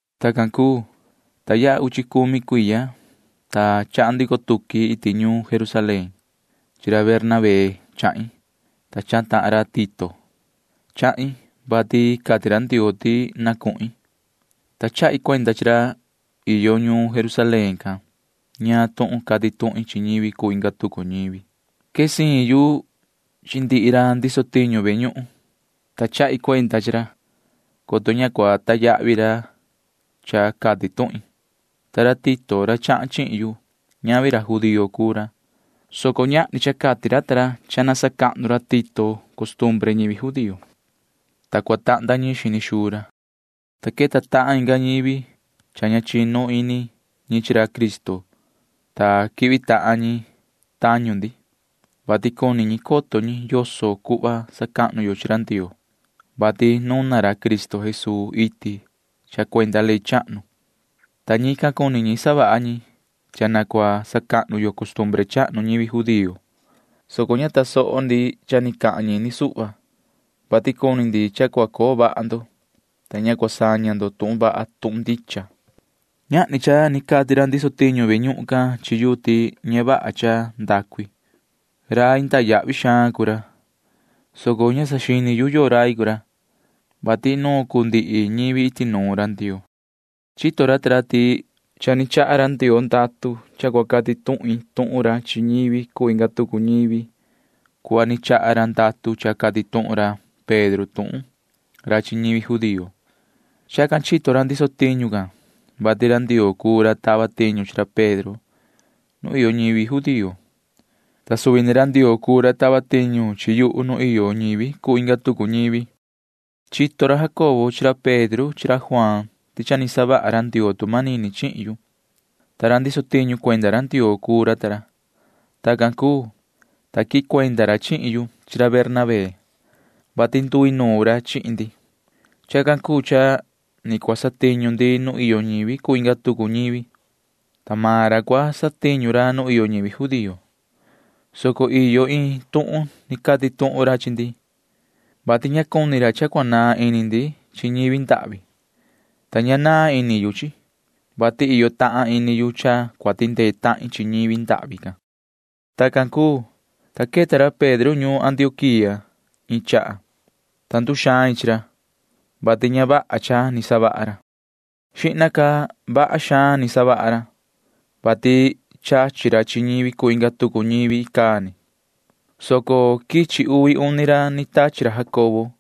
Tacan cuu, ta yaha uchi cumi cuiya, ta chahan ndico tuqui iti ñuun Jerusalén. Chi ra Bernabé chahin, ta chahan tahan ra Tito. Chahin, vati cati ra Ndioo ti na cuhin, ta chahi cuenda chi ra iyo ñuun Jerusalén can ñaan tuhun cati tuhin chi ñivi cuu inga tucu ñivi. Quee siin yu chi ndihi ra ndiso tiñu ve ñuhun, ta chahi cuenda chi ra, coto ña cua cunda yahvi cha cati tuhin. Ta ra Tito, ra chahan chihin yu―ñavi ra judío cuu ra, soco ñahni cha cati ra ta ra ti cua sacahnu ra Tito can costumbre ñivi judío, ta cua tahnda ñiin xini xuu ra. Cha queta tahan inga ñivi, soco ña chinu ndicha ini ñi chi ra Cristo, ta quihvi tahan ñi, vati cuni coto ñi yoso cuhva sacahnu yo chi ra Ndioo, vati nuna ra Cristo Jesuu iti cha cuenda ley chahnu. Tacan ni savaha ñi, vati ña ndicha ñi, ta cuni ñi cha cua sacahnu yo costumbre chahnu ñivi judío, soco ña tasoho ndi cha ni cahan ñi ni suhva, vati cuni ndi cha cua coo vaha ndo, ta ña cua saña ndo tuhun vaha tuhun ndicha. Ñahni cha ni cati ra ndiso tiñu ve ñuhun can chi yuhu ti ña vaha cha ndacu i. Rai cahnu ndicha cuu ra, soco ña saxini yu yoo rai cuu ra, vati inuun cuu ta ndihi ñivi iti nuun ra Ndioo. Chito ra ta ra ti cha ni chaha ra Ndioo ndatu cha cua cati tuhin tuhun ra chi ñivi cuu inga tucu ñivi cuhva ni chaha ra ndatu cha cati tuhun ra Pedro tuhun ra chi ñivi judío. Tacan chito ra ndiso tiñu can, vati ra Ndioo cuu ra tava tiñu chi ra Pedro nu iyo ñivi judío, ta suvi ni ra Ndioo cuu ra tava tiñu chi yuhu nu iyo ñivi cuu inga tucu ñivi. Chito ra Jacobo chi ra Pedro chi ra Juaan ti cha ni savaha ra Ndioo tu manini chihin yu, ta ra ndiso tiñu cuenda ra Ndioo cuu ra ta ra. Tacan cuu, ta quihin cuenda ra chihin yu chi ra Bernabé, vati nduinuun ra chihin ndi. Chacan cuu cha ni cua satiñu maan ndi nu iyo ñivi cuu inga tucu ñivi, ta maan ra cua satiñu ra nu iyo ñivi judío, soco iyo iin tuhun cati tuhun ra chi ndi, vati ña cuni ra cha cua naan ini ndi chi ñivi ndahvi. Tacan ni ña naan ini yu, vati iyo tahan ini yu cha cua tindee tahin chi ñi ndahvi can. Tacan cuu, ta queta ra Pedro ñuun Antioquía iin chaha, ta nduxain chi ra, vati ña vaha cha ni savaha ra. Xihna ca vaha xaan ni savaha ra, vati chachi ra chi ñivi cuu inga tucu ñivi icaa ni, soco quichi uvi uni ra ni tachi ra Jacobo.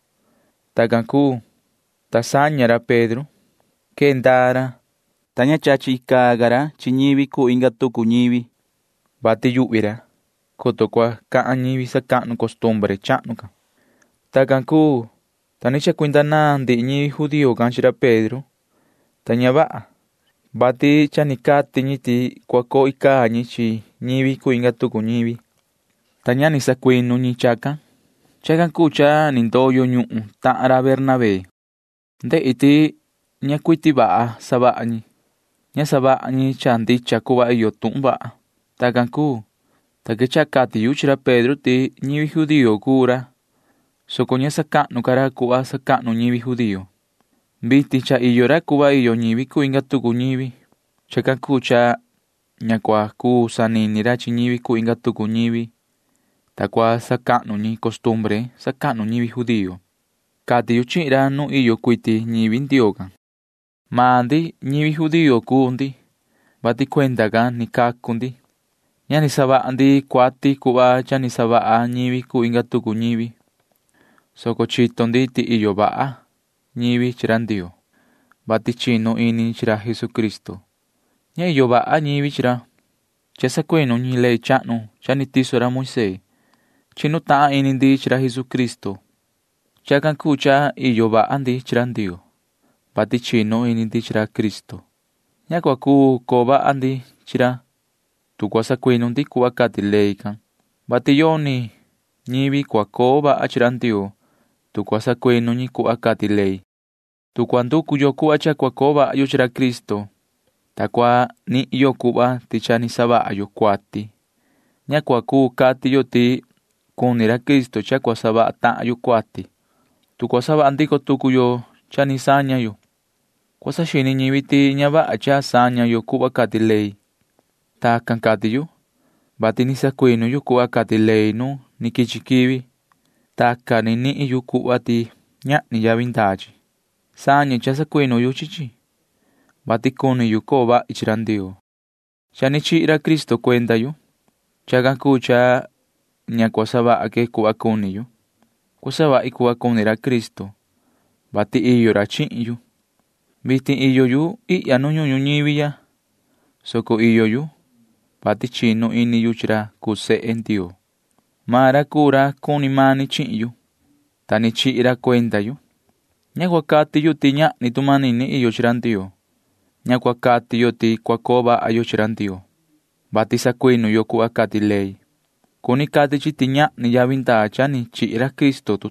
Tacan cuu, ta saña ra Pedro. Quee ndaa ra, [ta ña chachi ca ra chi ñivi cuu inga tucu ñivi,] vati yuhvi ra, coto cua cahan ñivi cuni sacahnu costumbre chahnu can. Tacan cuu, ta ni chacuinda naan ndihi ñivi judío can chi ra Pedro, ta ña vaha, vati cha cati ñi ti cua coo ñi chi ñivi cuu inga tucu ñivi icaa ni, ta ña ni sacuinu ñi chacan. Chacan cuu cha ni ndoyo ñuhun tahan ra Bernabé. Ndehi ti ña cuiti vaha savaha ñi. Ña savaha ñi cha ndicha cuhva iyo tuhun vaha. Tacan cuu, ta quechaha cati yu chi ra Pedro ti ñivi judío cuu maan ra, soco ña sacahnu ca ra cuhva sacahnu ñivi judío. Vitin cha iyo ra cuhva iyo ñivi cuu inga tucu ñivi. Chacan cuu cha ña cua cuu sanini ra chi ñivi cuu inga tucu ñivi, ta cua sacahnu ñi costumbre sacahnu ñivi judío, cati yu chihin ra nu iyo cuiti ñivi Ndioo can. Maan ndi―ñivi judío cuu ndi, vati cuenda can ni cacu maan ndi. Ña ni savaha ndi cuati cuhva cha ni savaha ñivi cuu inga tucu ñivi, soco chito ndi ti iyo vaha ñivi chi ra Ndioo, vati chinu ini ñi chi ra Jesucristo. Ña iyo vaha ñivi chi ra, vati sacuinu ñi ley chahnu cha ni tiso ra Moisee. Chinu tahan ini ndi chi ra Jesucristo. Chacan cuu cha cha iyo vaha ndi chi ra Ndioo, vati chinu ini ndi chi ra Cristo. Ña cua cuu coo vaha ndi chi ra, tu cua sacuinu ndi cuhva cati ley can, vati yoni ñivi cua coo vaha chi Ndioo, tu sacuinu ni ñi cuhva cati ley. Tu cua nducu yo cuhva cha cua coo vaha yo chi ra Cristo, ta cua nihin yo cuhva ti cha ni savaha yo cuati, ña cua cuu cati yo ti cuni ra Cristo cha cua savaha tahan yo cuati. Tu cua savaha ndico tucu yo cha ni saña yo, cua saxini ñivi ti ña vaha cha saña yo cuhva cati ley. Tacan cati yu, vati ni sacuinu yu cuhva cati ley nu ni quichi quivi. Tacan ni nihin yu cuhva ti ñahni yavi ndaa chi. Sañe cha sacuinu yu chi chi, vati cuni yu coo vahi chi ra Ndioo. Cha ni chihi ra Cristo cuenda yuhu. Chacan cuu cha ña cua savaha que cuhva cuni yu. Cua savahi cuhva cuni ra Cristo, vati iyo ra chihin yu. Vitin iyo yu ihya nu ñuhun ñuñivi ya, soco iyo yu, vati chinu ini yu chi ra cuu sehe Ndioo. Maan ra cuu ra cuni mani chihin yu, ta ni chihi ra cuenda yu. Ña cua cati yu ti ñahni tu manini iyo chi ra Ndioo. Ña cua cati yo ti cua coo vaha yo chi ra Ndioo, vati sacuinu yo cuhva cati ley, coto cua cuu chi cuhva cua cati yo ti ñahni yavi ndaa cha ni chihi ra Cristo.